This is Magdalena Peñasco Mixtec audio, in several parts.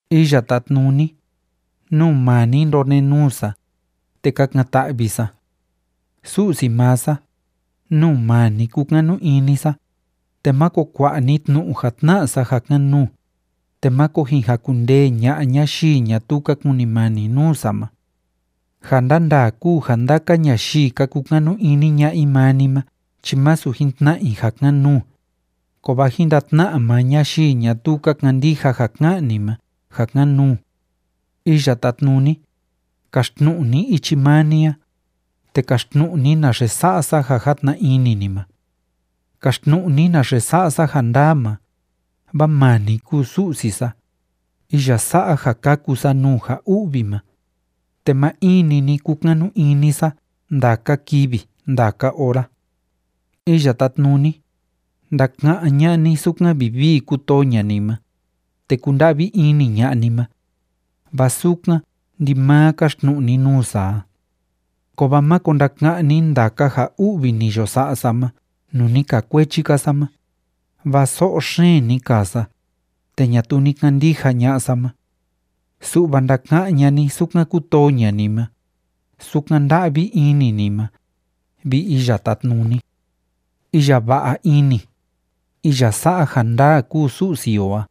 Iya Tátnuni, nuu maa ni ndonenuu sa, te kakan‑ta'vi sa. Su'si maa sa, nuu maa ni kúkanu ini sa, te máko kua'a ni tnu'u ja tna'a sa ja kan‑nuu, te máko jin jakundee ña'a ñayii ñatuu ka kunimani nuu sa ma. Ja ndandaa kúu ja ndaka ñayii ka kukanu ini ña'a i maa ni ma chi másu jin tna'a i ja kan‑nuu, kovaa jin ndatna'a maa ñayii ñatuu ka kandija ja ká'an ni ma ja kan‑nuu. Iya Tátnuni, kaxtnu'u ni ichi maa ni a, te kaxtnu'u ni naxe sa'a sa ja játna ini ni ma. Kaxtnu'u ni naxe sa'a sa ja ndaa ma, vaa maa ni kúu Su'si sa, iya sa'a ja kaku sa nuu ja u'vi ma, te maa in‑ni ni kúkanu ini sa ndaka kivi ndaka ora. Iya Tátnuni, ndaka'án ña'a ni sukan vivii kútoo ña'a ni ma, te kúnda'vi ini ña'a ni ma, vaa sukan ndimaa káxtnu'u ni nuu sa a. Kovaa máko ndaka'án ni ndaka ja u'vi ni yo sa'a sa ma nuu ni kaa kuechi‑ka sa ma, vaa so'o xeen ni kaa sa, te ñatuu ni kandija ña'a sa ma. Su'va ndaka'án ña'a ni sukan kútoo ña'a ni ma, sukan nda'vi ini ni ma, vi Iya Tátnuni. Iya va'a ini, iya sa'a ja ndaa kúu Su'si o a.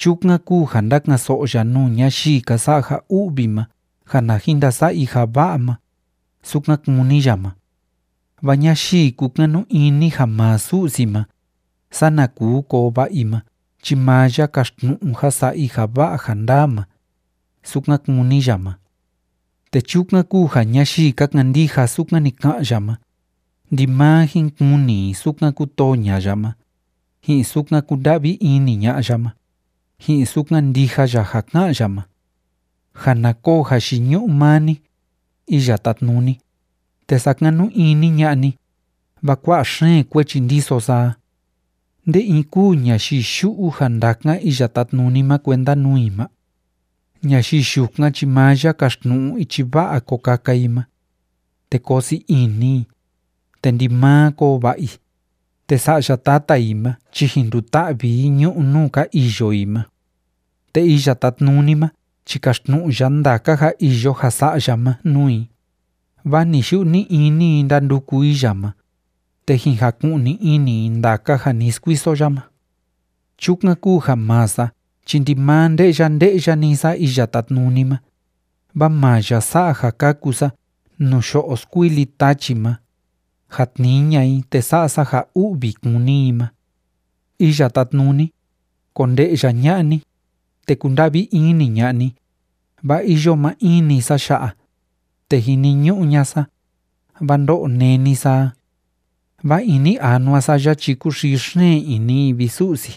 Chukan kúu ja ndáka'an‑so'o ya nuu ñayii ka sa'a ja u'vi ma ja na jin ndasa'a i ja va'a ma, sukan kúni ya ma. Vaa ñayii kúkanu ini ja maa Su'si ma, sana kuu koo va'a i ma chi maa ya kaxtnu'u ja sa'a i ja va'a ja ndaa ma, sukan kúni ya ma. Te chukan kúu ja ñayii ka kandija sukan ni ka'an ya ma, ndimaa jin kuni i sukan kútoo ña'a ya ma, ji'in sukan kúnda'vi ini ña'a ya ma, ji'in sukan ndija ya ja ká'an ya ma. Ja na koo jayiñu'u maa ni, Iya Tátnuni, te sakanu ini ña'a ni, vaa kua'a xeen kuechi ndiso sa a. ¿Nde in kúu ñayii yu'u ja ndakan Iya Tátnuni ma kuenda nuu i ma? Ñayii yukan ma chi maa ya kaxtnu'u ichi va'a ko kaka i ma. Te koo sii ini i, te ndimaa koo va'a i, te sa'ya tata i ma chi jin nduta'vi i ñu'ú nuu ka iyo i ma. Te Iya Tátnuni ma chi káxtnu'u ya ndaka ja iyo ja sa'a ya ma nuu i, vaa ni‑yu'u ni‑ini i ndánduku i ya ma, te jin jaku'ni ini i ndaka ja ni skuiso ya ma. Chukan kúu ja maa sa chi ndimaa nde'ya nde'ya‑ni sa Iya Tátnuni ma, vaa maa ya sa'a ja kaku sa nuu yo'o skuili tachi ma, ja tnii ña'a i te sa'a sa ja u'vi kúni i ma. Iya Tátnuni, konde'ya ña'a ni, te kunda'vi ini ña'a ni, vaa iyo maa in‑ni sa ya'a, te jiniñu'u ña'a sa, vaa ndó'o néni sa a. Vaa ini anua sa ya chi kúxii xeen ini i, vi Su'si.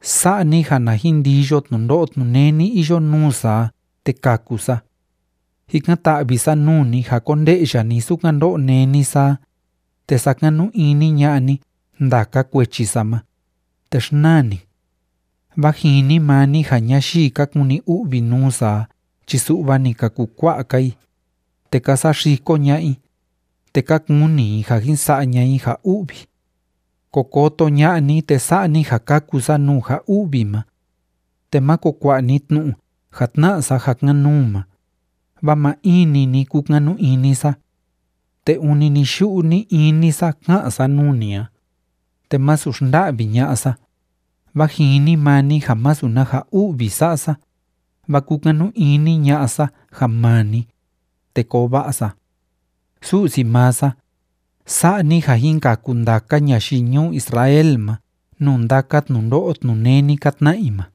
Sa'a ni ja na jin ndiyo tnundo'o tnuneni iyo nuu sa a, te kaku sa. Jikan‑ta'vi sa nuu ni ja konde'ya ni sukan ndó'o néni sa a, te sakanu ini ña'a ni ndaka kuechi sa ma, te xnaa ni. Vaa jini maa ni ja ñayii ka kuni u'vi nuu sa a chi su'va ni ka kukua'a‑ka i, te ka saxiko ña'a i, te ka kuni i ja jin sa'a ña'a i ja u'vi. Ko koto ña'a ni, te sa'a ni ja kaku sa nuu ja u'vi ma. Te máko kua'a ni tnu'u ja tna'a sa ja kan‑nuu ma, vaa maa in‑ni ni kúkanu ini sa. Te ûni ni‑yu'u ni‑ini sa ká'an sa nuu ni a, te másu xnda'vi ña'a sa, vaa jini maa ni ja masu na ja u'vi sa'a sa, vaa kúkanu ini ña'a sa ja maa ni, te koo va'a sa. Su'si maa sa, sa'a ni ja jin kaku ndaka ñayii ñuu Israel ma nuu ndaka tnundo'o tnuneni ka tna'a i ma.